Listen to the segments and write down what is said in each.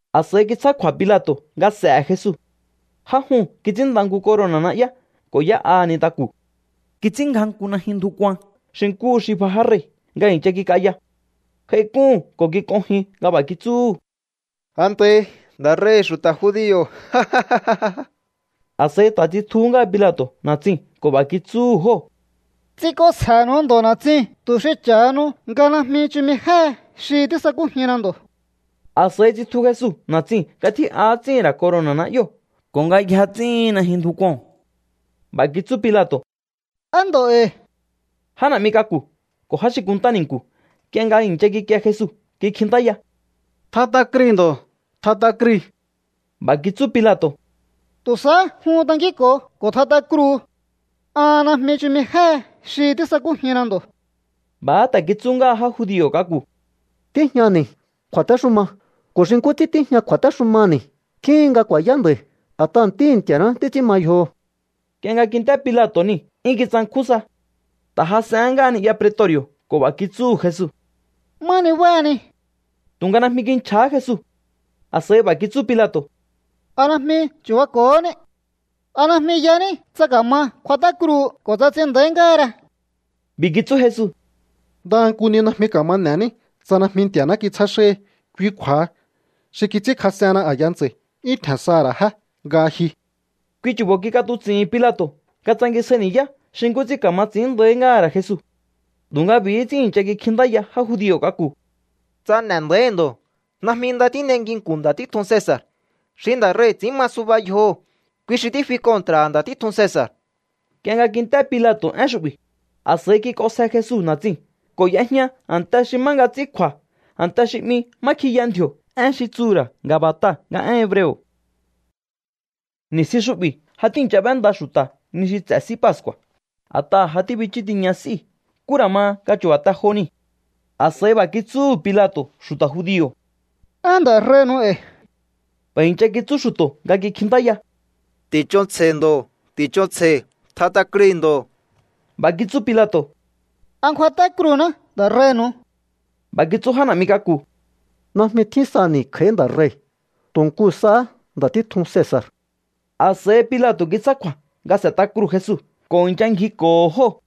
A̱s'a̱i kitsjá kju̱a̱ Pilato̱ nga s'e̱he̱ Jesu. Já juu̱n kits'ínnda nku corona̱ na'yá ko̱ y'é'aha̱ nintaku̱. Kits'ínngja nku najyun ndju kuan xi nkúhu xi bja já rei̱ nga i̱ncha kik'aya. J'aik'úhu̱n ko̱ kik'onjin nga b'a̱ kitsúhu̱: —¡Antahi, nda̱ rei̱hi̱ xu̱ta̱ judio̱! A̱s'a̱i ta̱ tsitjuhú ngáha Pilato̱ na̱tsiu̱n ko̱ b'a̱ kitsúhu̱ jóo̱: —Ts'ink'onsje̱nu̱u ndo̱ na̱tsiu̱n tu̱ xi cha̱hanu nga najmi chumi jéhe xi tísakújinna ndo̱. A̱s'a̱i tsitju Jesu na̱tsiu̱n nga tjí'a ts'íhi̱n ra̱ corona̱ na'yóo̱ ko̱ nga yja ts'íhin najyun ndju kuo̱n. B'a̱ kitsú Pilato̱: —¡Á ndo̱ e̱i̱! Já na̱'mi k'aku̱ ko̱ já xi kunntá ni̱nku̱, nk'ie nga i̱ncha kikie Jesu kikjintáya: —¡Tjat'a krui̱ ndo̱! ¡Tjat'a krui̱! B'a̱ kitsú Pilato̱: —Tu̱ sahá jun tankínko̱o ko̱ tjat'a kruu̱. An najmi chumi jéhe xi tísakújinna ndo̱. B'a̱há ta̱ kitsú ngáha já judio̱ k'aku̱: —Tíjñani̱ kju̱a̱téxuma ko̱ xi nkú ts'ín tíjña kju̱a̱téxumani̱ tjíhin nga ku̱a̱yá nda̱i̱, a̱t'aha̱ Ntíhi̱ Nti̱a̱ná títs'ín ma yjoho̱. Nk'ie nga kint'é Pilato̱ niu̱, 'yún kitsankjún sa. Ta̱ jas'ehén ngáha ni'ya pretori̱o̱ ko̱ b'a̱ kitsúhu̱ Jesu: —¿Má nibáhani? Tu̱nga najmi kinchja̱há Jesu. A̱s'a̱i b'a̱ kitsú Pilato̱: —¿A najmi chu̱bako̱hóní? ¿A najmi yaní tsa ka̱ma kjuat'á kruu̱hu ko̱ tsa ts'in nda̱í ngáhara? B'i̱ kitsú Jesu: —Ndaha nku ni najmi ka̱ma n'e̱ní tsa najmi Nti̱a̱ná kitsjá xáhi. Kui kju̱a̱ha, xi kits'ínkjas'ehenna a̱ya ntsa̱i̱ 'yún tje̱n saha̱ ra̱ jé nga ji. Kui chu̱bo̱ kik'atuts'i̱hi̱n Pilato̱ nga tsangisjai ni̱yá xi nkú ts'ín ka̱ma ts'i̱ín nda̱í ngáha̱ ra̱ Jesu. Tu̱nga b'i̱hí ts'ín i̱ncha kikjintáya já judio̱ k'aku̱: —¡Tsa n'e̱ nda̱íhi̱ ndo̱, najmi nda tín'ei nginku̱n nda̱ títjun Cesa̱r! ¡Xi nda̱ rei̱ ts'ín ma suba yjoho̱, kui xi tífi kontra̱ha̱ nda̱ títjun Cesa̱r! Nk'ie nga kint'é Pilato̱ én xu'bi̱, a̱s'a̱i kik'onsje Jesu na̱tsiu̱n ko̱ y'ejña a̱nte xi má nga ts'ín kju̱a̱, a̱nte xi 'mi Má Kjiya Ndji̱o̱, én xi tsuhu̱ ra̱ Gabata nga én hebreo̱. Ni̱stjin xu'bi̱ ja tíi̱ncha b'énda xu̱ta̱ ni xi ts'e̱ S'í Pascu̱a̱, a̱t'aha̱ ja tíbichú tiña s'íu̱. Nkú ra̱ ma nga chu̱ba̱ te jo niu̱. A̱s'a̱i b'a̱ kitsúhu̱ Pilato̱ xu̱ta̱ judio̱: —¡Á nda̱ rei̱nu̱u e̱i̱! B'a̱ i̱ncha kitsú xu̱to̱ nga kikjintáya: —¡Ti̱ch'onsje̱i ndo̱! ¡Ti̱ch'onsje̱i! ¡Tjat'a krui̱ ndo̱! B'a̱ kitsú Pilato̱: —¿A ngjuat'á kruu̱ná nda̱ rei̱nu̱u? B'a̱ kitsú já na̱'mi k'aku̱: —¡Najmi tjín sani̱ kj'a̱í nda̱ rei̱, tu̱ nku sahá nda̱ títjun Cesa̱r! A̱s'a̱i Pilato̱ kitsjá kju̱a̱ nga s'e̱t'a kruu̱ Jesu ko̱ i̱ncha ngjiko̱ho̱ jóo̱.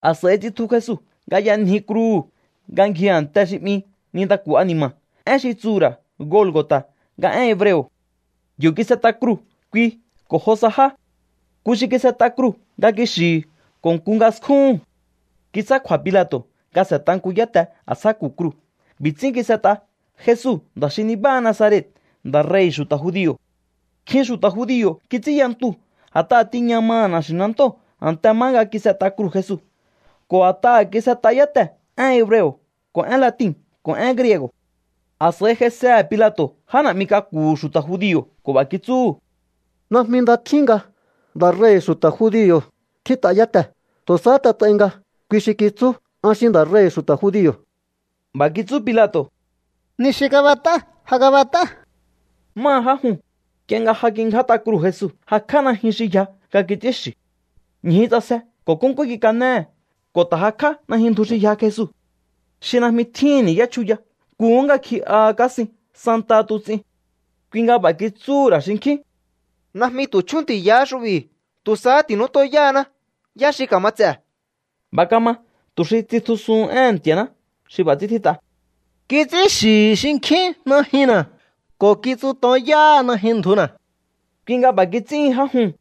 A̱s'a̱i tsitju Jesu nga y'anji kruu̱hu̱ nga ngji a̱nte xi 'mi Nintaku̱ A̱ni̱ma̱, én xi tsuhu̱ ra̱ Golgo̱ta̱ nga én hebreo̱. Yo̱ kis'et'a kruu̱ kui ko̱ jo sa já. Nku xi kis'et'a kruu̱ nga kixi̱hi̱ ko̱ nku nga skúhu̱n. Kitsjá kju̱a̱ Pilato̱ nga s'e̱t'a nku yáte a̱ntsjáku̱ kruu̱. B'i̱ ts'ín kis'et'a: “Jesu, nda̱ xi nibáha Nazaret, nda̱ rei̱hi̱ xu̱ta̱ judio̱.” Nkjin xu̱ta̱ judio̱ kits'ínya ntuu̱, a̱t'aha̱ tiña maha̱ na̱xi̱nantóo̱ a̱nte má nga kis'et'a kruu̱ Jesu ko̱ a̱t'aha̱ kis'et'a yátee̱ én hebreo̱ ko̱ én latin ko̱ én griego̱. A̱s'a̱i j'aisehe̱ Pilato̱ já na̱'mi k'aku̱hu̱ xu̱ta̱ judio̱ ko̱ b'a̱ kitsúhu̱: —Najmi nda tjín nga: “Nda̱ rei̱hi̱ xu̱ta̱ judio̱”, tjít'a yátee̱. Tu̱ sahá t'et'ai nga: “Kui xi kitsú: An xi nda̱ rei̱hi̱ xu̱ta̱ judio̱.” B'a̱ kitsú Pilato̱: —Ni xi kab'et'á, ja kab'et'á. Máha já juu̱n, nk'ie nga ja kingját'a kruu̱ Jesu, jakj'á najyun xi yja nga kits'ínxi̱. Ñju ts'asje ko̱ nkúnkú kikanéhe̱. Ko̱ ta̱ jakj'á najyun ndju xi yja Jesu, xi najmi tjíhi̱n ni̱yá chjuya. Nkuhú nga ngji'aha kásin santaha tuts'in. Kui nga b'a̱ kitsúhu̱ ra̱ xinkjín: —Najmi tu̱ chjunti̱yaá xu'bi̱. Tu̱ sahá ti̱nútonyáhaná yá xi ka̱ma ts'e̱. B'a̱ kama tu̱ xi tsitjusuhun éhe̱n Nti̱a̱ná xi b'a̱ ts'ín tjít'a: “Kits'ínxi̱hi̱ xinkjín najyunna̱ ko̱ kitsutonyáha najyun ndjuna̱.” Kui nga b'a̱ kits'íhin já juu̱n.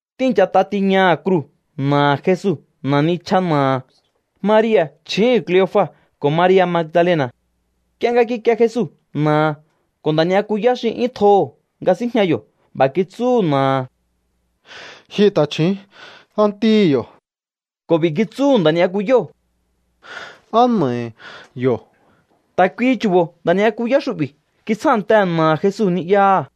Tíi̱nchat'a tiñaha̱ kruu̱ na̱aha̱ Jesu, na̱ nichja na̱aha̱, Maria̱ chju̱úhu̱n Kleofa ko̱ Maria̱ Magdalena̱. Nk'ie nga kikie Jesu na̱aha̱ ko̱ nda̱ ni'yakuyá xi 'yún tjoho̱ nga síjña yo̱, b'a̱ kitsúhu̱ na̱aha̱: —Ji ta̱chju̱ún, á ntíhi̱ yo̱. Ko̱ b'i̱ kitsúhu̱ nda̱ ni'yakuyóo̱: —Á na̱ahi̱ yo̱. Ta̱ kuihi chu̱bo̱ nda̱ ni'yakuyá xu'bi̱ kitsjántehe̱ na̱aha̱ Jesu ni'yaha̱.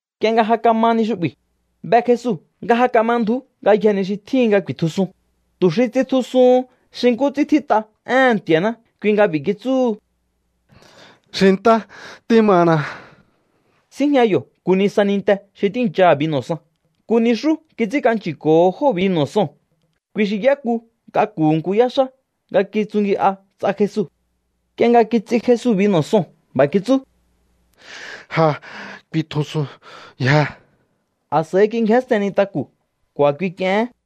Nk'ie nga ja kama ni xu'bi̱, be Jesu nga ja kama ndju̱ú ngayjee̱ ni xi tjíhin nga ku̱i̱tjusun. Tu̱ xi tsitjusuhun xi nkú ts'ín tjít'a éhe̱n Nti̱a̱ná, kui nga b'i̱ kitsúhu: —Xintá tímana. Síjña yo̱ nku nisa ninte xi tíi̱ncha binu̱ san. Nku nixú kits'ínk'anchi̱ko̱ho jóo̱ binu̱ soo̱n. Kui xi y'éku k'aku̱hu̱ nku yáxá nga kitsungi'a ts'a Jesu. Nk'ie nga kits'i Jesu binu̱ soo̱n, b'a̱ kitsú: —Ja kuitjusunyje. A̱s'a̱i kingjénsten nintaku̱ ko̱ a̱kui k'iehén.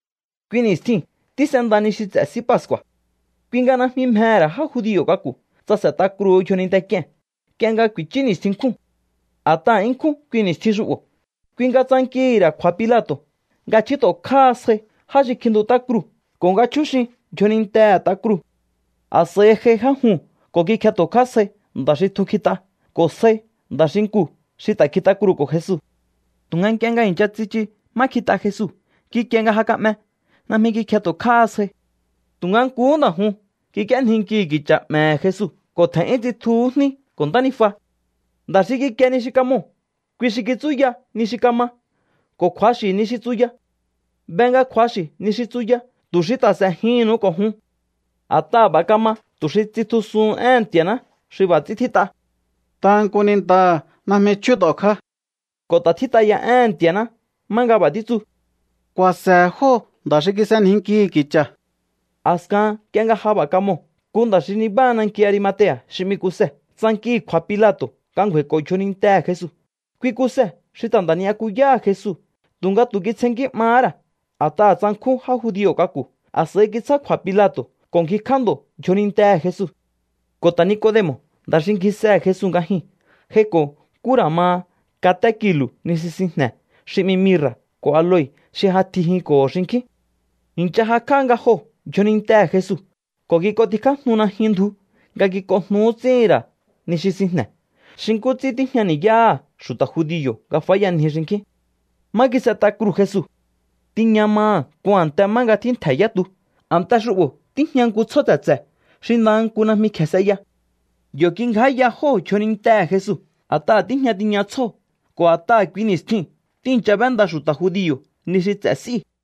Kui ni̱stjiu̱n tís'enda ni xi ts'e̱ S'í Pascu̱a̱. Kui nga najmi mjehe̱ ra̱ já judio̱ k'aku̱ tsa s'e̱t'a kruu̱ yjoninte k'ie̱n nk'ie nga ku̱i̱chú ni̱stjin nkjúu̱n, a̱t'aha̱ 'yún ṉkjún kui ni̱stjin xu'bo̱. Kui nga tsankihi̱ ra̱ kju̱a̱ Pilato̱ nga chjút'o̱kjáha sjai já xi kjintut'á kruu̱ ko̱ nga chjúxin yjonintehe̱ t'a kruu̱. A̱s'a̱i j'ai já juu̱n ko̱ kikjet'o̱kjá sjai nda̱ xi tjun kjit'a ko̱ sjai nda̱ xinkuu̱ xi ta̱ kjit'a kruu̱ko̱ Jesu. Tu̱nga nk'ie nga i̱ncha tsichu má kjit'a Jesu, kikie nga ja ka'me. Najmi kikjet'o̱kjáha sjai. Tu̱nga nkuhú nda̱ juu̱n kik'íénjinkihi̱ ki̱cha̱ 'me̱he̱ Jesu ko̱ tje̱n'yún tsitjuhú jní ko̱ ntánijua. Nda̱ xi kikie ni xi kamoo̱, kui xi kitsúya ni xi kama ko̱ kju̱axi̱ ni xi tsuya. Be nga kju̱axi̱ ni xi tsuya tu̱ xi ta̱ s'e̱jihi̱nnu̱u ko̱ jun. A̱t'aha̱ b'a̱ kama tu̱ xi tsitjusuhun éhe̱n Nti̱a̱ná xi b'a̱ ts'ín tjít'a: “Ndaha nku nintaha̱ najmi chjút'o̱kjá.” Ko̱ ta̱ tjít'a ya éhe̱n Nti̱a̱ná má nga b'a̱ títsu: “Ku̱a̱se̱he̱ jóo̱ nda̱ xi kis'enjinkihi̱ ki̱cha̱.” A̱skahan nk'ie nga ja b'a̱ kamoo̱, nku nda̱ xi nibáha nanki Arimatea̱ xi 'mi Kuse tsankihi̱ kju̱a̱ Pilato̱ nga ngju̱a̱i̱ko̱ yjonintehe̱ Jesu. Kui Kuse xi ta̱ nda̱ ni'yakuyáha̱ Jesu tu̱nga tu̱ kitsjennkí 'mahá ra̱ a̱t'aha̱ tsankjún já judio̱ k'aku̱. A̱s'a̱i kitsjá kju̱a̱ Pilato̱ ko̱ ngjikj'á ndo̱ yjonintehe̱ Jesu. Ko̱ ta̱ Nicodemo̱, nda̱ xi ngjisehe̱ Jesu nga jyuu̱n, j'aiko̱ nkú ra̱ ma katé kilu̱ ni xi sinjne̱ xi 'mi mirra̱ ko̱ aloe xi j'atjijinko̱ho̱ xinkjín. I̱ncha jakj'á nga joo̱ yjonintehe̱ Jesu ko̱ kik'ontikjájnu najyun ndju nga kik'onjnu ts'íhi̱n ra̱ ni xi sinjne̱, xi nkú ts'ín tíjña ni̱yáha̱ xu̱ta̱ judio̱ nga fáyanji xinkjín. Má kis'et'a kruu̱ Jesu, tiña maha̱ nku a̱nte má nga tjíntje̱ yá tu. A̱nte xu'bo̱ tíjña nku tsjó tse̱tse̱ xi ndaha nku najmi kje̱e s'eya. Yo̱ kingjáya jóo̱ yjonintehe̱ Jesu, a̱t'aha̱ tíjña tiña tsjóo̱ ko̱ a̱t'aha̱ kui ni̱stjiu̱n tíi̱ncha b'énda xu̱ta̱ judio̱ ni xi ts'e̱ s'íu̱.